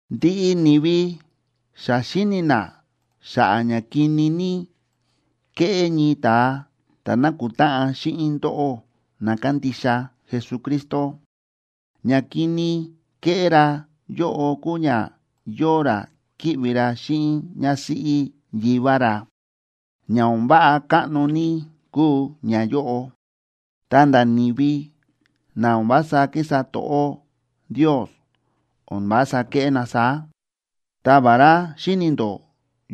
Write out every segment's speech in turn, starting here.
Ndiꞌi ni̱vi xa xíni̱ na xa̱ꞌa̱ ña kini ní kéꞌé ñii ta̱a ta̱ nákutáꞌan xíꞌin ndóꞌó na kándixa Jesucristo. Ña kini kéꞌé ra yóꞌo kúu ña yóo ra kíꞌvi ra xíꞌin ñásíꞌí yivá ra. Ña o̱n váꞌa káꞌno ní kúu ñayóꞌo, ta̱nda̱ ni̱vi na o̱n vása kísa to̱ꞌó Ndios o̱n vása kéꞌé na saá. Ta vará xíni̱ ndó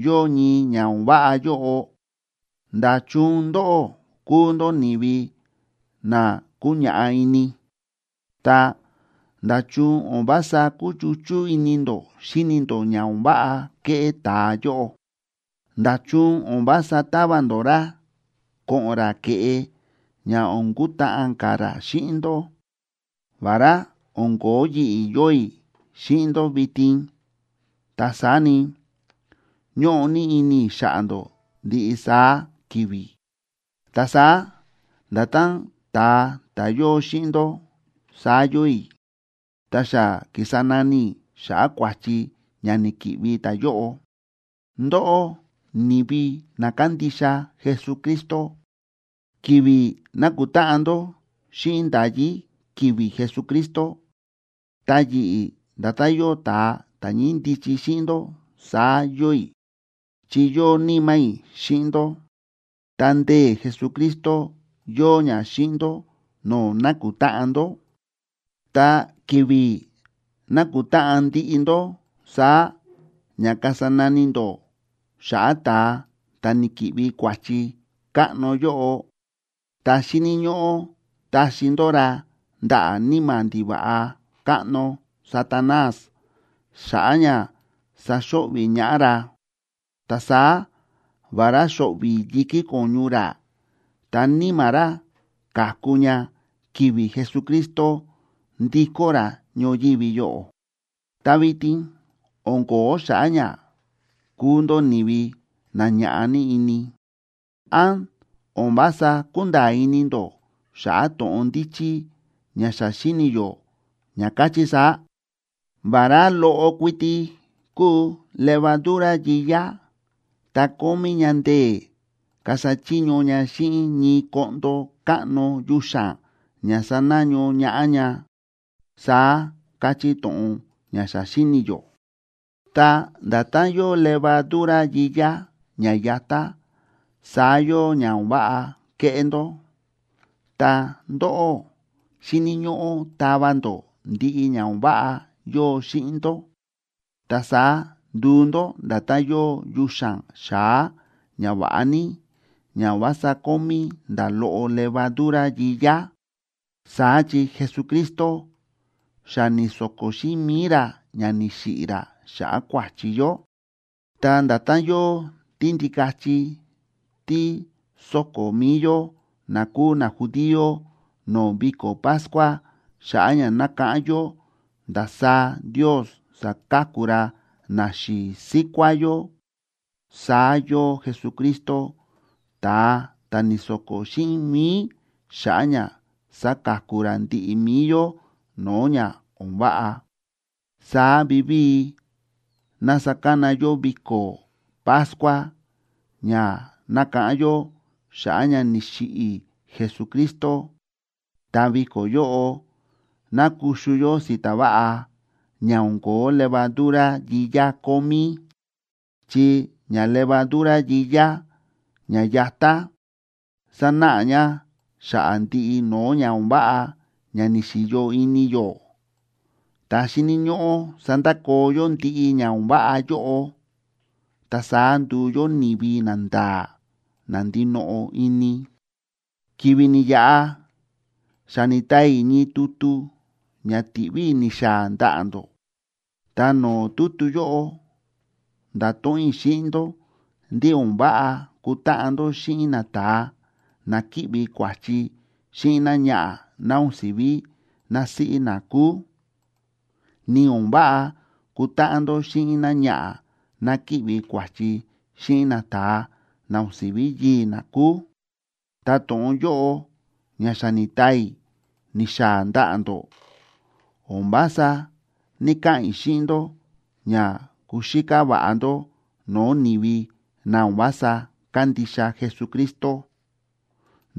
yóo ñii ña o̱n váꞌa yóꞌo, ¿nda̱chun ndóꞌó kúu ndó ni̱vi na kúñaꞌá ini? Ta, ¿nda̱chun o̱n vása kúchuchú ini ndó xíni ndó ña o̱n váꞌa kéꞌé ta̱a yóꞌo? ¿Nda̱chun o̱n vása tava ndó ra ko̱ꞌo̱n ra ke̱ꞌe ña o̱n kutáꞌan ka̱ ra xíꞌin ndó? Vará o̱n ko̱ó yi̱ꞌi̱ yóo i̱ xíꞌin ndó vitin, ta saá ni, ñóꞌo ní ini i̱ xa̱ꞌa̱ ndó ndiꞌi saá ki̱vi̱. Ta saá nda̱tán ta̱a ta̱ yóo xíꞌin ndó, saá yóo i̱, ta xa ki̱sa nani i̱ xa̱ꞌa̱ kua̱chi ña ni̱ki̱ꞌvi ta̱yóꞌo. Ndóꞌó, ni̱vi na kándixa Jesucristo, ki̱vi̱ nákutáꞌan ndó xíꞌin nda̱yí ki̱vi̱ Jesucristo, ta yi̱ꞌi̱ nda̱tán yóo ta̱a ta̱ ñíndichi xíꞌin ndó saá yóo i̱, chi yóo níma̱ i̱ xíꞌin ndó. Ta ndee̱ Jesucristo yóo ña xíꞌin ndó no̱o̱ nákutáꞌan ndó. Ta ki̱vi̱ nakutáꞌan ndiꞌi ndó saá ña kasa nani ndó xa̱ꞌa̱ ta̱a ta̱ ni̱ki̱ꞌvi kua̱chi káꞌno yóꞌo, ta xíni̱ ñóꞌó taxi ndó ra ndaꞌa̱ níma̱ ndiva̱ꞌa káꞌno Satanás xa̱ꞌa̱ ña saxo̱ꞌvi̱ ñaꞌá ra. Ta saá vará xo̱ꞌvi̱ yi̱kí ko̱ñu ra, ta níma̱ ra ka̱ku ña ki̱vi̱ Jesucristo ndikó ra ñoyívi yóꞌo. Ta vitin o̱n ko̱ó xa̱ꞌa̱ ña kúu ndó ni̱vi na ña̱ꞌa ní ini. ¿Án o̱n vása kúnda̱a̱ ini ndó xa̱ꞌa̱ to̱ꞌon ndíchí ña xa xíni̱ yó, ña káchí saá?: “Vará loꞌo kuiti kúu levadura yiyá, ta kómí ña ndee̱ kasa chiño ña xíꞌin ñii koꞌndo káꞌno yuxa̱n ña sanaño ñaꞌá ña”, saá káchí to̱ꞌon ña xa xíni̱ yó. Ta nda̱tán yóo levadura yiyá ña yatá, saá yóo ña o̱n váꞌa kéꞌé ndó. Ta ndóꞌó xíni̱ ñóꞌó tava ndó ndiꞌi ña o̱n váꞌa yóo xíꞌin ndó. Ta saá nduu ndó nda̱tán yóo yuxa̱n xa̱á ña va̱ꞌa ní, ña o̱n vása kómí nda̱ loꞌo levadura yiyá. Saá chi Jesucristo xa ni̱so̱ko̱ xíꞌin mi̱i ra ña ni̱xiꞌi̱ ra xa̱ꞌa̱ kua̱chi yó. Ta nda̱tán yóo tíndikachi tí sóko̱ mi̱i yó na kúu najudío no̱o̱ viko̱ Pascua xa̱ꞌa̱ ña nákáꞌán yó ndasaá Ndios sa̱ka̱ku ra naxi̱i̱ síkuá yó, saá yóo Jesucristo ta̱a ta̱ ni̱so̱ko̱ xíꞌin mi̱i xa̱ꞌa̱ ña saka̱ku ra ndiꞌi mi̱i yó no̱o̱ ña o̱n váꞌa. Saá vivíi ná sakana yó viko̱ Pascua ña nákáꞌán yó xa̱ꞌa̱ ña ni̱xiꞌi̱ Jesucristo, ta viko̱ yóꞌo ná kuxu yó si̱ta̱ váꞌa ña o̱n ko̱ó levadura yiyá kómí. Chi ña levadura yiyá ña yatá sánáꞌa ña xa̱ꞌa̱ ndiꞌi no̱o̱ ña o̱n váꞌa ña ni̱xi̱yo ini yó. Ta xíni̱ ñóꞌó sandakoo yó ndiꞌi ña o̱n váꞌa yóꞌo, ta saá nduu yó ni̱vi nanda̱a̱, na ndinoꞌo ini. Ki̱vi̱ ni̱yaꞌa xa ni̱taa i̱ ñii tutu ña ti̱ꞌví i̱ ni̱xaa̱ ndaꞌa̱ ndó. Ta no̱o̱ tutu yóꞌo nda̱to̱ꞌon i̱ xíꞌin ndó ndí o̱n váꞌa kutáꞌan ndó xíꞌin nata̱a na kíꞌvi kua̱chi xíꞌin náñaꞌa̱ ná o̱n si̱ví násíꞌí na kúu, ni o̱n váꞌa kutáꞌan ndó xíꞌin náñaꞌa̱ ná kíꞌvi kua̱chi xíꞌin nata̱a na o̱n si̱ví yii̱ ná kúu. Ta to̱ꞌon yóꞌo ña xa ni̱taa i̱ ni̱xaa̱ ndaꞌa̱ ndó, o̱n vása ní‑kaꞌa̱n i̱ xíꞌin ndó ña kuxíká va̱ꞌa ndó no̱o̱ ni̱vi na o̱n vása kándixa Jesucristo,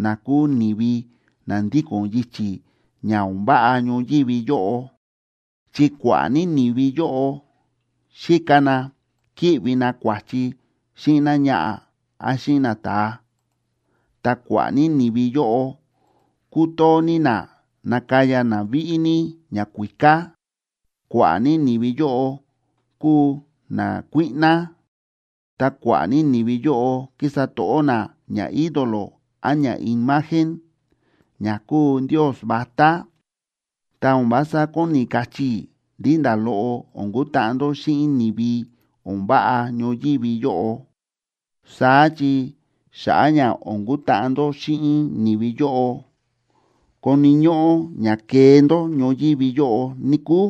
na kúu ni̱vi na ndíko̱n yichi̱ ña o̱n váꞌa ñoyívi yóꞌo. Chi kua̱ꞌa̱ ní ni̱vi yóꞌo xíka na kíꞌvi na kua̱chi xíꞌin náñaꞌa̱ án xíꞌin nata̱a, ta kua̱ꞌa̱ ní ni̱vi yóꞌo kútoo ní na nakaya na víꞌí ní ñakuíká, kua̱ꞌa̱ ní ni̱vi yóꞌo kúu nakuíꞌná, ta kua̱ꞌa̱ ní ni̱vi yóꞌo kísa to̱ꞌó na ñaídolo án ñaimagen, ña kúu ndios vatá. Ta o̱n vása kóni kachí i̱ ndí nda̱ loꞌo o̱n kutáꞌan ndó xíꞌin ni̱vi o̱n váꞌa ñoyívi yóꞌo. Saá chi xa̱ꞌa̱ ña o̱n kutáꞌan ndó xíꞌin ni̱vi yóꞌo, koni̱ ñóꞌó ña kee ndó ñoyívi yóꞌo, níkúu.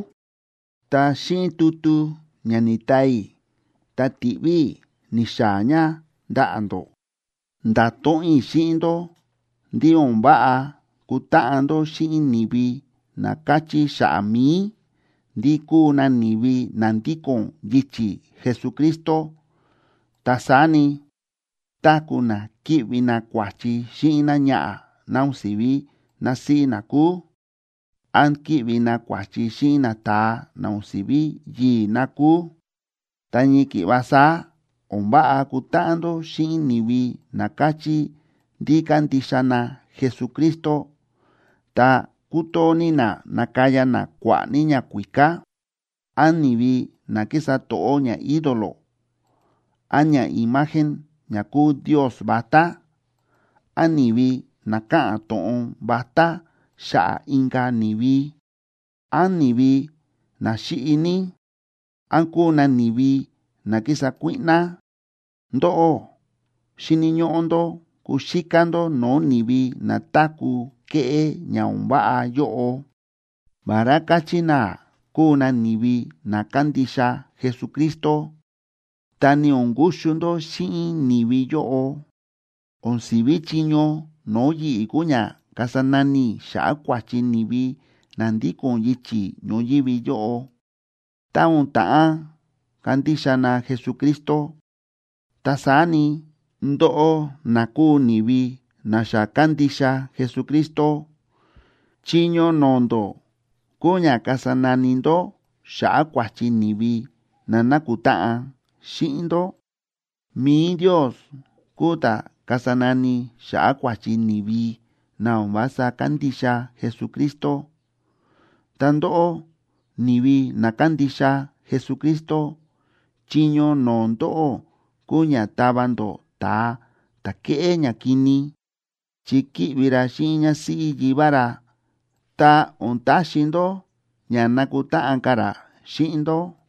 Ta xíꞌin tutu ña ni̱taa i̱ ta ti̱ꞌví i̱ ni̱xaa̱ ña ndaꞌa̱ ndó, nda̱to̱ꞌon i̱ xíꞌin ndó ndí o̱n váꞌa kutáꞌan ndó xíꞌin ni̱vi na káchí xa̱ꞌa̱ mi̱i, ndí kúu na ni̱vi na ndíko̱n yichi̱ Jesucristo, ta saá ni, táku̱ na kíꞌvi na kua̱chi xíꞌin náñaꞌa̱ ná o̱n si̱ví násíꞌí na kúu, án kíꞌvi na kua̱chi xíꞌin nata̱a na o̱n si̱ví yii̱ ná kúu. Ta ñii ki̱ꞌva saá o̱n váꞌa kutáꞌan ndó xíꞌin ni̱vi na káchí ndí kándixa na Jesucristo, ta kútoo ní na nakaya na kua̱ꞌa̱ ní ñakuíká, án ni̱vi na kísa to̱ꞌó ñaídolo án ñaimagen ña kúu ndios vatá, án ni̱vi na káꞌa̱n to̱ꞌon vatá xa̱ꞌa̱ inka̱ ni̱vi, án ni̱vi na xíꞌi ní, án kúu na ni̱vi na kísa kuíꞌná. Ndóꞌó, xíni̱ ñóꞌó ndó kuxíká ndó no̱o̱ ni̱vi na táku̱ kéꞌé ña o̱n váꞌa yóꞌo, vará káchí na kúu na ni̱vi na kándixa Jesucristo. Ta ni o̱n kuxu ndó xíꞌin ni̱vi yóꞌo. O̱n si̱ví chiño no̱o̱ yi̱ꞌi̱ kúu ña kasa nani i̱ xa̱ꞌa̱ kua̱chi ni̱vi na ndíko̱n yichi̱ ñoyívi yóꞌo, tá o̱n ta̱ꞌán kandixa na Jesucristo. Ta saá ni, ndóꞌó na kúu ni̱vi na xa kándixa Jesucristo, chiño no̱o̱ ndó kúu ña kasa nani ndó xa̱ꞌa̱ kua̱chi ni̱vi na nákutáꞌan xíꞌin ndó. Mi̱i Ndios kúu ta̱ kasa nani xa̱ꞌa̱ kua̱chi ni̱vi na o̱n vása kándixa Jesucristo. Ta ndóꞌó, ni̱vi na kándixa Jesucristo, chiño no̱o̱ ndóꞌó kúu ña tava ndó ta̱a ta̱ kéꞌé ñakini, chi kíꞌvi ra xíꞌin ñásíꞌí yivá ra, ta o̱n taxi ndó ña nakutáꞌan ka̱ ra xíꞌin ndó.